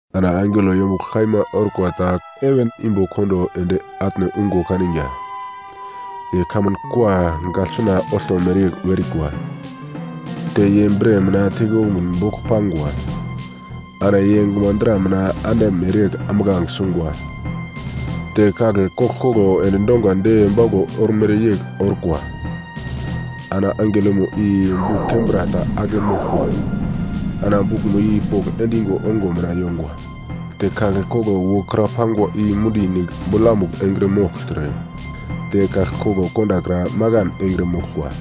Ana angelo yombuglo kaima orkwa ta heven imbo kondo ende atne ungo kaniga. Ye kamun kua gaglsuna olto mereyegl werikwa, te ye bre mina teikombukun bogl pangwa. Ana ye gumadra mina ande mereyegl ambuglange sungwa, te kagle koglkoglo endi dongwa de bauglo ormere yegl orkwa. Ana angelomo i buk kembra ta ake moglkwa. Ana bukmo i pogl endigo ongo mina yongwa. Te kagle koglo wokra pangwa i mundi nigl bolamugl engre mogltre, te kagle koglo kondakra makan engre moglkwa.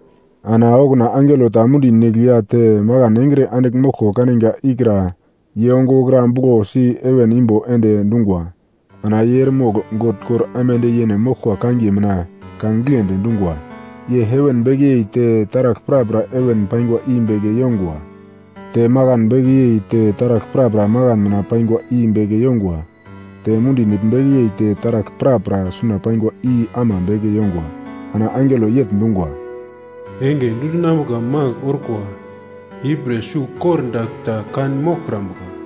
Ana okuna angelo ta mundi nigl ya te makan engre andigl moglko kaniga ikra ye ongo wokra buglosi heven imbo ende dungwa. Ana ye eremogl God kor aimande yene moglkwa kangiye mina ka giglendi dungwa. Ye heven beke yei te taragl prapra heven paingwa i beke yongwa. Te makan beke yei te taragl prapra makan mina paingwa i beke yongwa. Te mundi nigl beke yei te taragl prapra suna pangwa i ama beke yongwa. Ana angelo yegl dungwa, “Enge dundinambuka magl orkwa, ipre sugl kordagl ta kan moglkrambuka.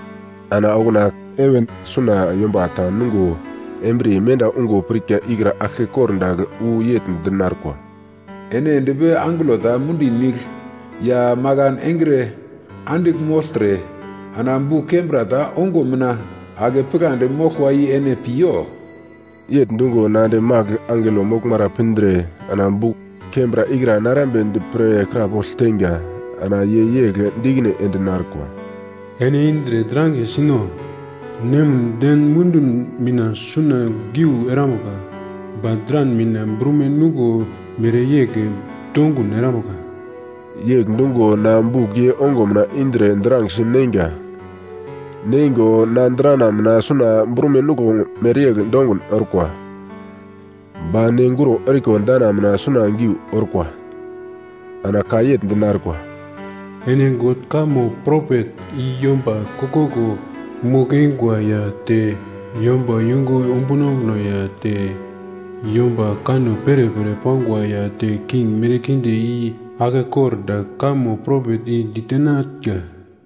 Ana okuna heven suna yomba ta nungo embriye menda ungo pirka ikra aglke kordagl wu yegl dinarkwa, “Ene endpi angelo ta mundi nigl ya makan engre andigl mogltre, ana buk kembra ta ongo mina ake pigladi moglkwa i ene pi yo.” Yegl dungo na ende magl angelo moglmara pindre ana buk kembra ikra narambedi pre krapogl teinga, ana ye yegl di ikine ende narkwa, “Ene indre drangesi no. Nemin den mundun mina suna geu erambuka. Ba dran mina brume nuglo mereyegl dongun erambuka.” Yegl dungo na buk ye ongo mina indre drangesi neinga. Neingo na drana mina suna brume nuglo mereyegl dongun orkwa, ba ne guro eriko dana mina suna geu orkwa. Ana ka yegl dinarkwa, “Ene God kamo propet i yomba koglkoglo mogl-eingwa ya te yomba yungu ombuno ombuno ya te yomba kanno perepere pangwa ya te king merkinde i aglke kordagl kamo propet i ditenatnga.”